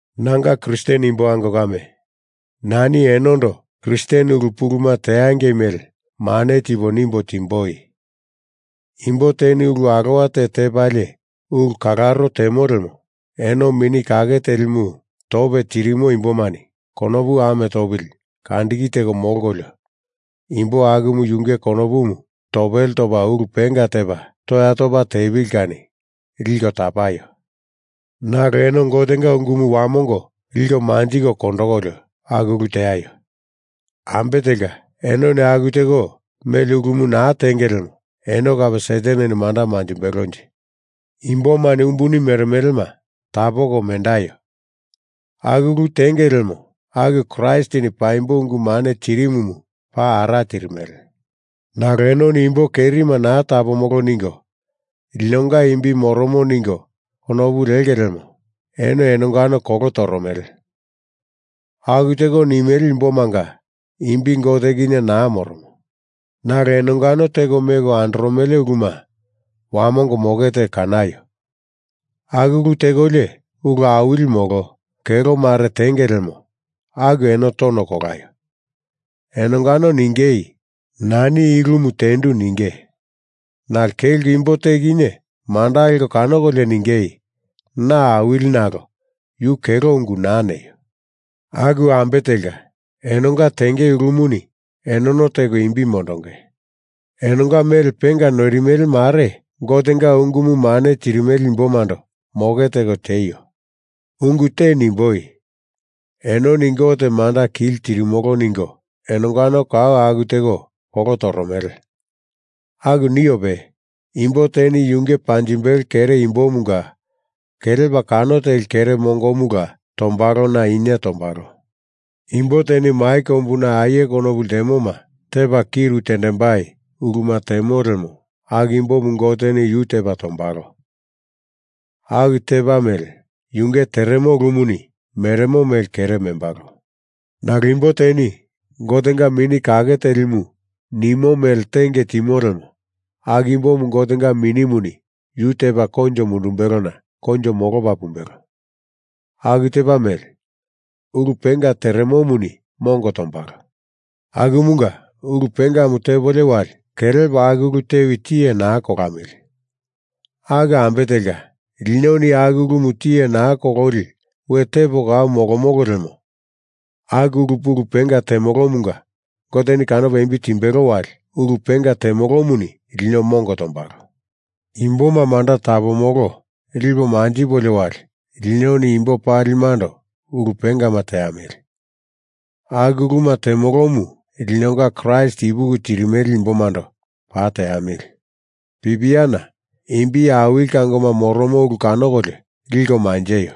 Nanga Kristen imbo ango kame, nani enondo Kristen ulu puluma teangei mele mane tipo nimbo timboi. Imbo teni ulu alowa te tepalie ulu kalaro temo lemo eno Mini Kake Telimu tope tirimo imbomani konopu ame topili kandiki teko molkolio imbo akumu yunge konopumu topele topa ulu penga tepa toya topa tepili kani liko tapaio. Nalo eno Gotenga ungumu wamongo liko manjiko kondokolio aku ulu teaio. Ambe telka enoni aku teko mele ulumu naa tenge lemo eno kape Sataneni manda manjimbelonje. Imbomani umbuni meremelema tapoko mendaio. Aku ulu tenge lemo aku Kraistini paimbo ungu mane tirimumu paa ara tirimele. Nalo enoni imbo kerima naa tapomolo ningo linonga imbi moromo ningo konopu lenge lemo eno enongano kolo toromele. Aku teko nimele imbomanga imbi Gote kinye naa moromo. Nalo enongano teko meko andoromele uluma wamongo moke teko kanaio. Aku ulu tekolio ulu awili molo kelo mare tenge lemo aku eno tono kolaio. Enongano ningei nani i ulumu tendu ninge. Nalo kelko imbo te kinye manda leko kanokolio ningei na awili nalo yu kelo ungu naa neio. Aku ambe telka enonga tenge ulumuni enono teko imbi mondonge. Enonga mele penga noirimele mare Gotenga ungumu mane tirimele imbomando moke teko tieio. Ungu te nimboi. Enoni Gote manda kili tirimolo ningo enongano kau aku teko kolo toromele. Aku niope imbo teni yunge panjimbelo kere imbomunga kelepa kano teli kere mongomula tombalona inie tombalo. Imbo teni mai kombuna aie konopu ltemoma tepa kiru timbei uluma temo lemo aku imbomu Goteni yu tepa tombalo. Aku tepa mele, yunge teremo ulumuni meremo mele kere membalo. Nalo imbo teni Gotenga Mini Kake Telimu nimo mele tenge timo lemo aku imbomu Gotenga Minimuni yu tepa koinjo mundumbelona koinjo molopa pumbelo. Aku tepa mele ulu penga teremomuni mongo tombalo. Akumunga ulu pengamu tepolio wali kelepo aku ulu tewi tiye naa kolamili. Aku ambe telka linoni aku ulumu tiye naa kololi we tepo kau molomolo lemo aku ulu pulu penga temolomunga Goteni kanopa imbi timbelo wali ulu penga temolomuni lino mongo tombalo. I imboma manda tapomolo lipo manjipolio wali linoni imbo palimando ulu pengama teamili. Aku uluma temolomu linonga Kraist ipuki tirimele imbomando paa teamili. Pipiana imbi awili kangoma moromo ulu kanokolio liko manjeio.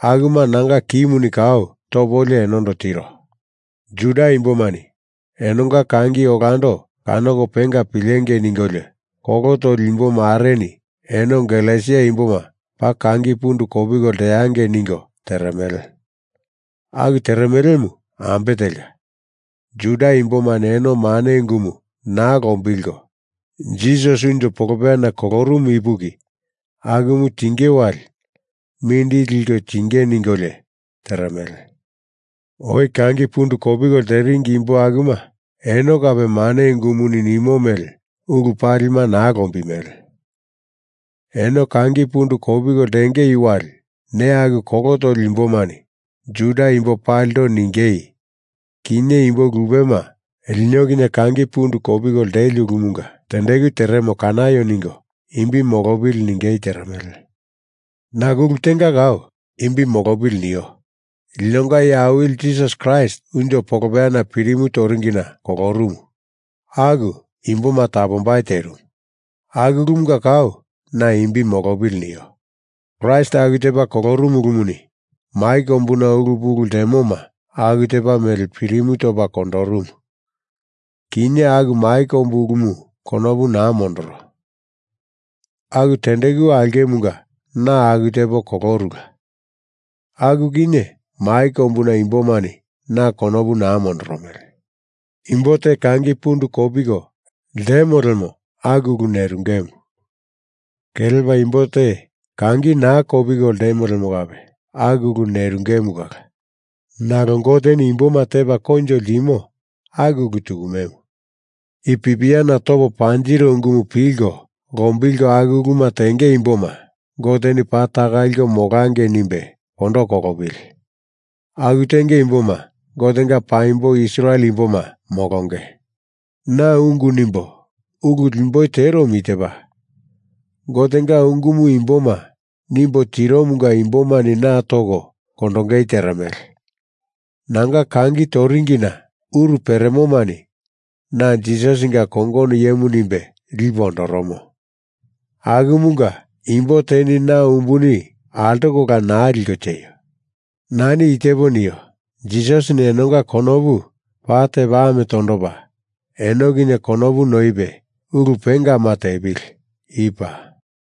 Akuma nanga kimuni kau topolio enondo tiro. Juda imbomani enonga kangi olando kanoko penga pilengei ningolio kolo toli imbomareni eno Galesia imboma paa kangi pundu kopiko leangei ningo teremele. Aku teremelemu ambe telka Juda imbomani eno mane ungumu naa lombilko Jisasi unjo polopeyana kolorumu ipuki akumu tinge wali mindili liko tingei ningolio teremele. Oi kangi pundu kopiko leringi imbo akuma eno kape mane ungumuni nimo mele ulu palima naa lombimele. Eno kangi pundu kopiko lenge wali ne aku kolo toli imbomani Juda imbo palindo ningei kinye imbo lupema lino kinye kangi pundu kopiko leli ulumunga tendeku teremo kanaio ningo imbi molopili ningei teremele. Nalo ulu tenga kau imbi molopili nio. Linonga Iye Awili Jisasi Kraist unjo polopeyana pirimu toringina kolorumumu aku imboma tapombai terimu. Aku ulumunga kau na imbi molopili nio. Kraist aku tepa kolorumu ulumuni mai kombuna ulu pulu ltemoma aku tepa mele pirimu topa kondorumu. Kinye aku mai kombu ulumu konopu naa mondoro. Aku tendeku aulkemunga na aku tepo kolorula. Aku kinye mai kombuna imbomani na konopu naa mondoromele. Imbo te kangi pundu kopiko lemo lemo aku ulu nerungemu. Kelepa imbo te kangi naa kopiko lemo lemo kape aku ulu nerungemu kala. Nalo Goteni imboma tepa koinjo ltimo aku ulu tukumemu. I pipiana topo panjiro ungumu pilko lombilko aku uluma tenge imboma Goteni paa taka liko molangei nimbe kondo kolopili. Aku tenge imboma Gotenga paimbo Israel imboma molonge. Na ungu nimbo ulu lemboi teromu i tepa Gotenga ungumu imboma nimbo tiromunga imbomani na toko kondongei teremele. Nanga kangi toringina uru peremomani na Jisasinga kongono iyemu nimbe lipe ondoromo. Akumunga imbo teni na umbuni altokola naa liko tieio. Nani i tepo nio, Jisasini enonga konopu paa tepa ame tondopa eno kinye konopu noipe ulu pengama tepili. I paa.